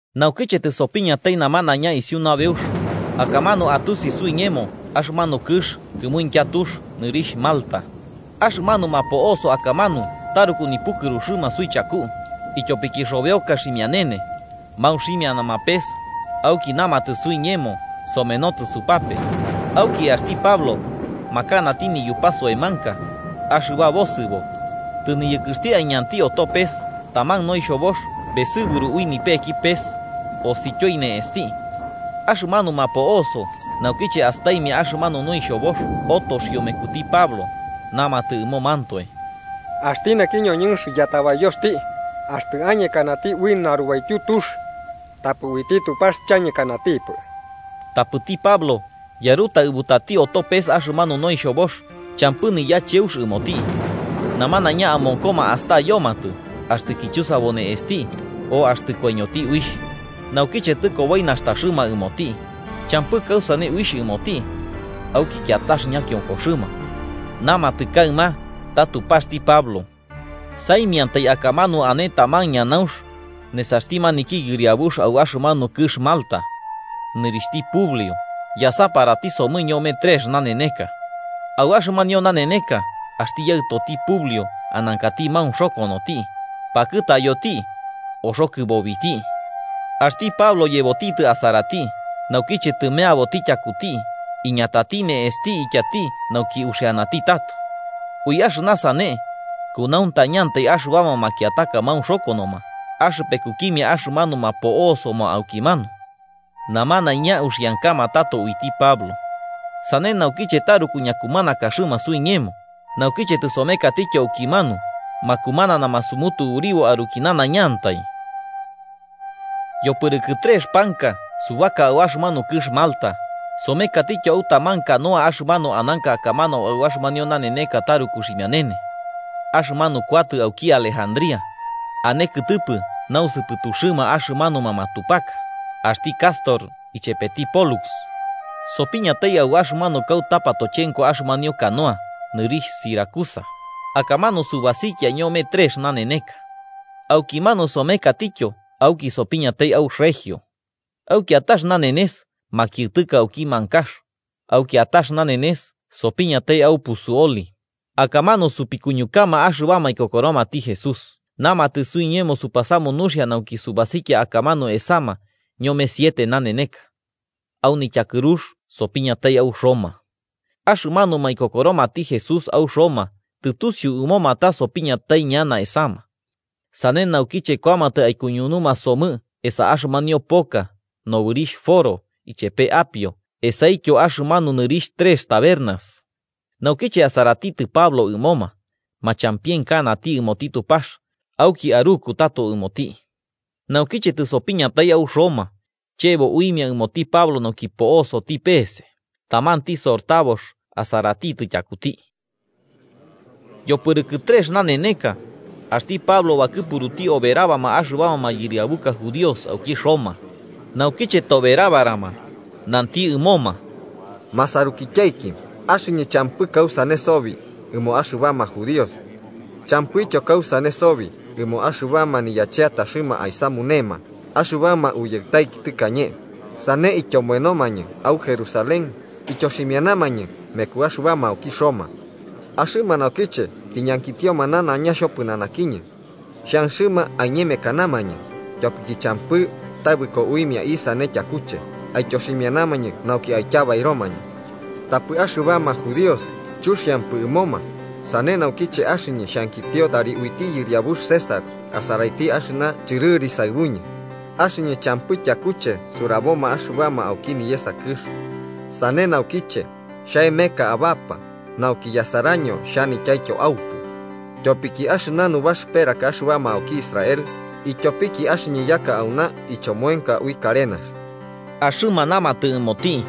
Naukiche tɨsopiñatai namanaiña isiu nabeux, akamanu atusi suiñemo axɨmanu kɨx kɨmuintya tux, nɨrixh Malta. Axɨmanuma po'osoma akamanu taruku nipukɨruxɨma suichaku, ityopiki xobeoka ximianene, maunximianama pes, auki namatɨ suiñemo somenotɨ supape. Auki axti Pablo, makanati niyupa soemanka axɨba bosɨbo, tɨniyɨkɨxti aiñanti oto pes taman noixhobox besɨburu ui nipeki pes, osityoi ne'esti. Axɨmanuma po'oso naukiche astaimia axɨmanu noixhobox otoxio mekuti Pablo, namatɨ ɨmomantoe: “Axti naki ñoñɨnx yatabayoxti, axtɨ añekanati ui narubaityu tux, tapɨ uiti Tupax, chañekanatipɨ.” Tapɨti Pablo yarutaɨbutati oto pes axɨmanu noixhobox, champɨ niyacheux ɨmoti. Namanaiña amonkoma astayomatɨ axtɨ kichusabo ne'esti o axtɨ koiñoti uixh. Naukiche tɨkoboi nastaxɨma ɨmoti, champɨ kausane uixh ɨmoti, auki kiatax ñakionkoxɨma, namatɨ kaɨma ta Tupaxti Pablo. Saimiantai akamanu ane taman ñanaunx nesaxti maniki yɨriabuxti au axɨmanu kɨx Malta, nɨrixhti Publio, yasaparati somɨ ñome trex naneneka. Au axɨmanio naneneka axti yaɨtoti Publio anankati maunxokonoti, pakɨtayoti, oxo kɨbobiti. Axti Pablo yebotitɨ asarati, naukiche tɨmeaboti tyakuti, iñatati ne'esti ityati nauki uxianati tato. Ui axɨna sane, kunauntañantai axɨbama makiataka maunxokonoma axɨpekukimia axɨmanuma po'osoma aukimanu. Namanaiña uxiankama tato uiti Pablo. Sane naukiche taruku ñakumanakaxɨma suiñemo, naukiche tɨsomekatityo aukimanu makumananama sumutuburibo aruki nanaiñantai. Yopɨrɨkɨ trex panka subaka au axɨmanu kɨx Malta, somekatityo au taman canoa axɨmanu ananka akamanu au axɨmanio naneneka taruku ximianene. Axɨmanu kuatɨ auki Alejandría, ane kɨtɨpɨ nausɨpɨtuxɨma axɨmanuma matupaka, axti Cástor ichepeti Pólux. Sopiñatai au axɨmanu kauta patochenko axɨmanio canoa nɨrixh Siracusa, akamanu subasikia ñome trex naneneka. Aukimanu somekatityo auki sopiñatai au Regio. Au kiatax nanenes makiɨtɨka auki mankax, au kiatax nanenes sopiñatai au Puzzuoli, akamanu sopikuñukama axɨbama ikokoromati Jesús, namatɨ suiñemo supasamu nuxia nauki subasikia akamanu esama ñome siete naneneka. Au nityakɨrux sopiñatai au Roma. Axɨmanuma ikokoromati Jesús au Roma tɨtusiu ɨmoma ta sopiñatai ñana esama. Sane naukiche kuamatɨ aikuñunuma somɨ esa axɨmanio poka, nobɨrixh Foro ichepe Apio esaityo axɨmanu nɨrixh Trex Tabernas. Naukiche asaratitɨ Pablo ɨmoma, machampienkanati ɨmoti Tupax, auki aruku tato ɨmoti. Naukiche tɨsopiñatai au Roma, chebo uimia ɨmoti Pablo nauki po'osoti pese, tamanti sortabox asaratitɨ tyakuti. Yopɨrɨkɨ trex naneneka, axti Pablo bakɨpuruti oberabama axɨbama mayɨriabuka judíos auki Roma. Naukiche toberabarama, nanti ɨmoma: –Ma sarukityaiki, axɨñɨ champɨ kausane sobi ɨmo axɨbama judíos, champɨityo kausane sobi ɨmo axɨna niyacheataxɨma aisamunema axɨbama uyaɨtaiki tɨkañe, sane ityomoenomañɨ au Jerusalén ityoximianamañɨ mekuma axɨbama auki Roma, axɨma naukiche tiñankitioma nanaiña xhopɨnanakiñɨ, xhanxɨma aiñemekanamañɨ, ityopiki champɨ tabɨko uimia isane tyakuche aityoximianamañɨ nauki aityabairomañɨ. Tapɨ axɨbama judíos chuxiampɨ ɨmoma, sane naukiche axɨñɨ xhankitio tari uiti yɨriabux César asaraiti axɨna chɨrɨri saɨbuñɨ, axɨñɨ champɨ tyakuche suraboma axɨbama auki niyesa kɨx. Sane naukiche xhaemeka abapa, nauki yasaraño xhanityaityo aupu. Tyopiki axɨna nubaxɨperaka axɨbama auki Israel, ityopiki axɨñɨ yaka auna ichomoenka ui karenax. Axɨma namatɨ ɨmoti: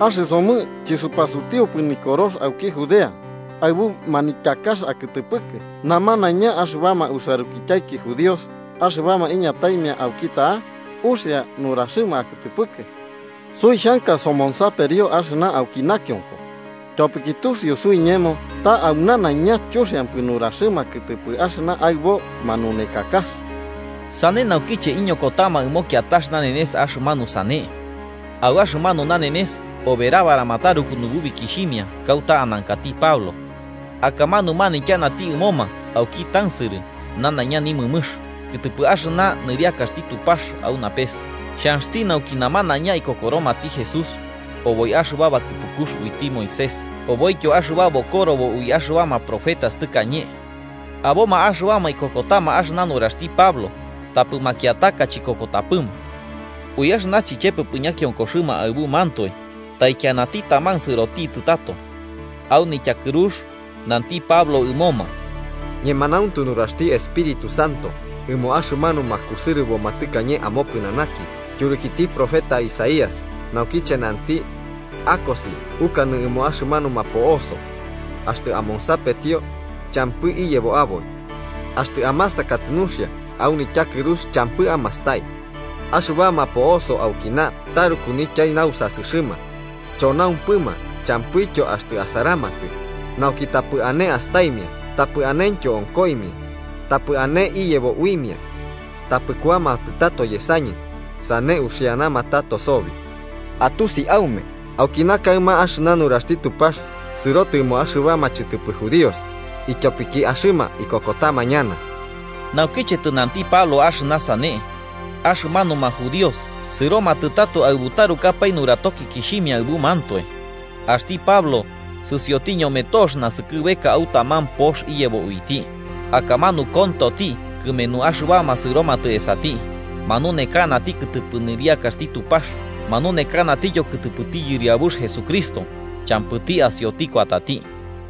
–Axɨsomɨ chɨsupasutiupɨ nikorox auki Judea aɨbu manityakax akɨtɨpɨkɨ, namanaiña axɨbama usarukityaiki judíos axɨbama iñataimia auki ta'a uxia nuraxɨma akɨtɨpɨkɨ. Suixhanka somonsaperio axɨna auki nakionko, tyopiki tusiu suiñemo ta au nanaiñantai chuxiampɨ nuraxɨma kɨtɨpɨ axɨna aɨbo manunekakax. Sane naukiche iñokotama ɨmo kiatax nanenes axɨmanu sane, au axɨmanu nanenes oberabarama taruku nububikixhimia kauta anankati Pablo. Akamanu manityanati ɨmoma auki tansɨrɨ nanaiña nimɨmɨx kɨtɨpɨ axɨna nɨriakaxti Tupax au napes xhanxti nauki namanaiña aikokoromati Jesús, oboi axɨba bakɨpukux uiti Moisés oboityo axɨba bokorobo ui axɨbama profetas tɨkañe. Aboma axɨbama ikokotama axɨna nuraxti Pablo, tapɨ makiataka chikokotapɨma. Ui axɨna chichepepɨ ñakionkoxɨma aɨbumantoe, taikianati taman sɨrotitɨ tato. Au nityakɨrux nanti Pablo ɨmoma: –Ñemanauntu nuraxti Espíritu Santo ɨmo axɨmanuma kusɨrɨboma tɨkañe amopɨnanaki tyurukiti profeta Isaías, naukiche nanti: ‘Akosi ukanɨ ɨmo axɨmanuma po'oso: Axtɨ amonsapetio, champɨ iyebo aboi. Axtɨ amasakatɨ nuxia, au nityakɨrux champɨ amastai. Axɨbama po'oso aukina taruku nityai nausasɨxɨma, chonaumpɨma champɨityo axtɨ asaramatɨ, nauki tapɨ ane astaimia tapɨ anentyo onkoimia, tapɨ ane iyebo uimia. Tapɨ kuamatɨ tato yesañɨ, sane uxianama tato sobi.’ Atusi aume, aukina kaɨma axɨna nuraxti Tupax sɨrotɨ ɨmo axɨbama chɨtɨpɨ judíos, ityopiki axɨma ikokotama ñana. Naukiche tɨnanti Pablo axɨna sane, axɨmanuma judíos sɨromatɨ tato aɨbu tarukapae nuratokikixhimia aɨbumantoe. Axti Pablo sɨsioti ñome tox nasɨkɨbeka au taman pox iyebo uiti, akamanu kontoti kɨmenu axɨbama sɨromatɨ esati. Manunekanati kɨtɨpɨ nɨriakaxti Tupax manunekanatityo kɨtɨpɨti Yɨriabux Jesucristo, champɨti asioti kuatati.